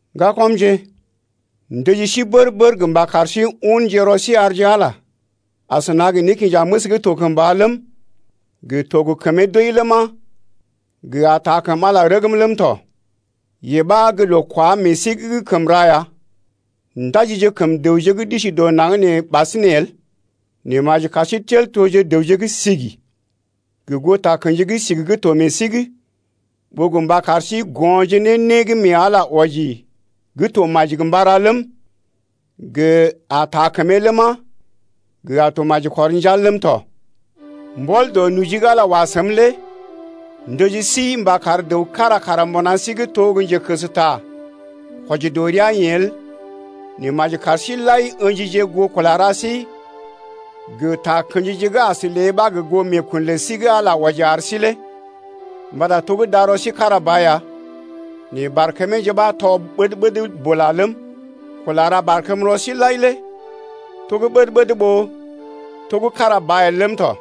Ŋgakɔmje, m’ndəji sí bər-bər gə mba kar sí unje rɔ sí arje Ala, asəna gə nékinjaməs gə́ to kəmba ləm, gə to gə kəmee doi ləma, gə a taa kəm Ala rəgm ləm tɔ. Yee ɓa gə loo kwá meḛ sí’g gə́ kəm ra ya. Ndaji kəm dəwje gə́ d’isi dɔ naŋg nee ɓasinè el, nɛ maji kar sí tel toje dəwje gə́ sigi gə goo takə̰ji gə́ sigi gə́ to meḛ sí’g, ɓó gə mba sí kar go̰je ne né gə́ mee Ala wɔji gə́ to maji gə mba ra ləm, gə a ta kəmee ləma, gə a to maji kɔr njal ləm tɔ. Mbɔl dɔ noji gə́ Ala wa səm lé m’ndəji sí mba kar dəw kára kara mbuna sí’g to gə́ njekəsta kwɔji dɔ rəa-yeḛ el, nɛ maji kar sí-seḭ lai ə̰jije goo kula ra sí gə takə̰jije gə́ as lée ɓa gə goo meekun lə sí gə́ Ala wɔji ar sí lé. Mbata to gə́ darɔ sí kára ba ya nɛ barkəmeeje ɓa tɔ ɓəd-ɓəd bula ləm, kula ra barkəmrɔ síje lai lé to gə́ ɓəd-ɓəd ɓó to gə́ kára ba el ləm tɔ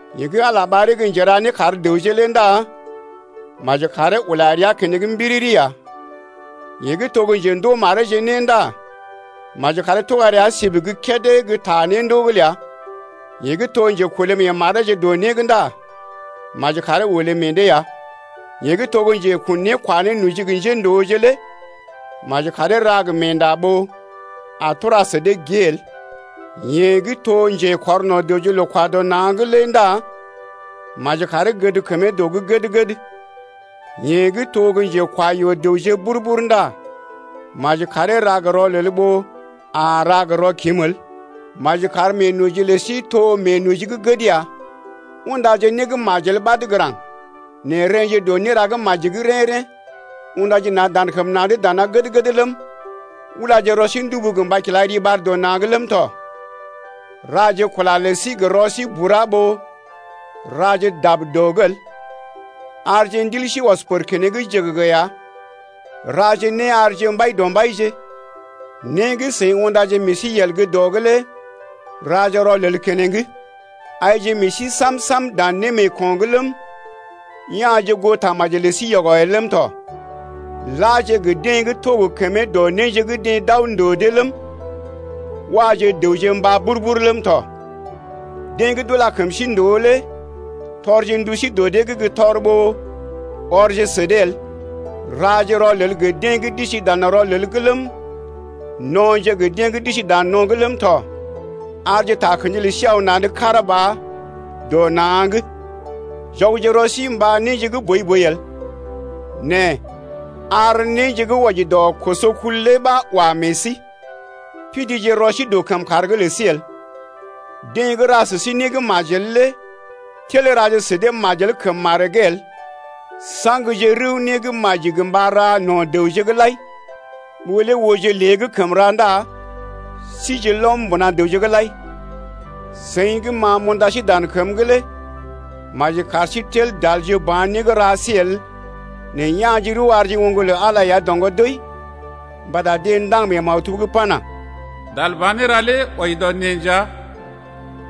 Yeḛ gə́ Ala ɓaree gə́ njera né kar dəwje lé ndá maji karee ula rəa keneŋ mbiriri ya. Yeḛ gə́ to gə́ njendoo mareeje né ndá maji karee tuga rəa sib gə́ kédé gə́ ta néndoo’g ləa. Yeḛ gə́ to njekolé meḛ mareeje dɔ né’g ndá maji karee olé meḛ dee ya. Yeḛ gə́ to gə́ njekun né kwa nénoji gə njéndooje lé maji karee ra gə meenda ɓó a tura sə dee gée el, yeḛ gə́ to njekɔrno̰ dəwje loo-kwa-dɔ-na̰’g lé ndá maji karee gəd kəmee dɔ’g gəd-gəd. Yeḛ gə́ to gə́ njekwa yɔ-dəwje bur-bur ndá maji karee ra gə rɔlel ɓó a ra gə rɔkim el. Maji kar meenoji lə sí to meenoji gə́ gəd ya. Undaje né gə́ majel ɓad gə́ raŋg nɛ rḛ́je dɔ néra gə́ maji’g rḛ́-rḛ́. Undaje na̰ dan kəm na̰’d dana gəd-gəd ləm, ulaje rɔ sí ndubu gə mba kila riɓar dɔ na̰’g ləm tɔ. Raje kula lə sí gə rɔ sí bura ɓó raje dab dɔ’g el. Arje ndil sí ɔs pər keneŋ jəgəgə ya. Raje né arje Mbaidɔmbaije. Né gə́ seḭ undaje meḛ sí yel gə́ dɔ’g lé raje rɔlel keneŋ. Aije meḛ sí sam-sam dan némeeko̰’g ləm, ya̰je goo tamaji lə sí yɔgɔ el ləm tɔ. Laje gə deḛ gə́ to gə kəmee dɔ néje gə́ deḛ d’aw ndòo dee ləm, waje dəwje mbá bur-bur ləm tɔ. Deḛ gə́ d’ula kəm sí ndòo lé tɔrje ndu sí dɔ dee’g gə́ tɔr ɓó ɔrje sə dee el. Raje rɔlel gə deḛ gə́ d’isi dan rɔlel’g ləm, no̰je gə deḛ gə́ d’isi dan no̰’g ləm tɔ. Arje takə̰ji lə sí aw na̰’d kára ba dɔ na̰’g. Jɔgje rɔ sí mba néje gə́ boi-boi el nɛ ar néje gə́ wɔji dɔ kosokul lé ɓa wa meḛ sí. Pidije rɔ sí dɔ kəmkàr’g lə sí el. Deḛ gə́ ra sə sí né gə́ majel lé tel raje sə dee majel kəm maree’g el. Saŋje rəw né gə́ maji gə mba ra no̰ dəwje’g lai. Ɓó lé ooje lée gə́ kəm ra ndá sije lɔm mbuna dəwje’g lai. Seḭ gə́ ma m’unda sí dan kəm’g lé maji kar sí tel dalje ba̰ né gə́ ra sí el nɛ ya̰je rəw arje oŋg lə Ala ya doŋgɔ doi. Mbata deḛ ndaŋg mee maktub’g pana: Dalba̰ néra lé wɔji dɔ neḛ nja,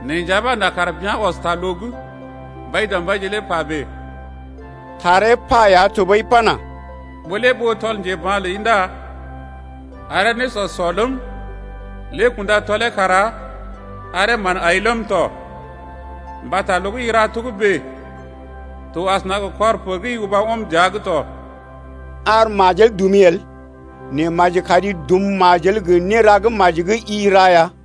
Neḛ nja ɓa n’a kar bea̰ ɔs ta loo’g. Mbaidɔmbaije lé pa bèe. Taree pa ya tɔɓəi pana: Ɓó lé ɓoo tɔl njeba̰ ləi ndá aree nésɔ sɔ ləm, Lé kunda tɔlee kara aree mán ai ləm tɔ, Mbata loo gə́ i ra togə́bè lé to asəna gə kɔr pər gə́ i uba ɔm dəa’g tɔ. Ar majel dumi el nɛ maji kari dum majel gə néra gə́ maji gə́ i ra ya.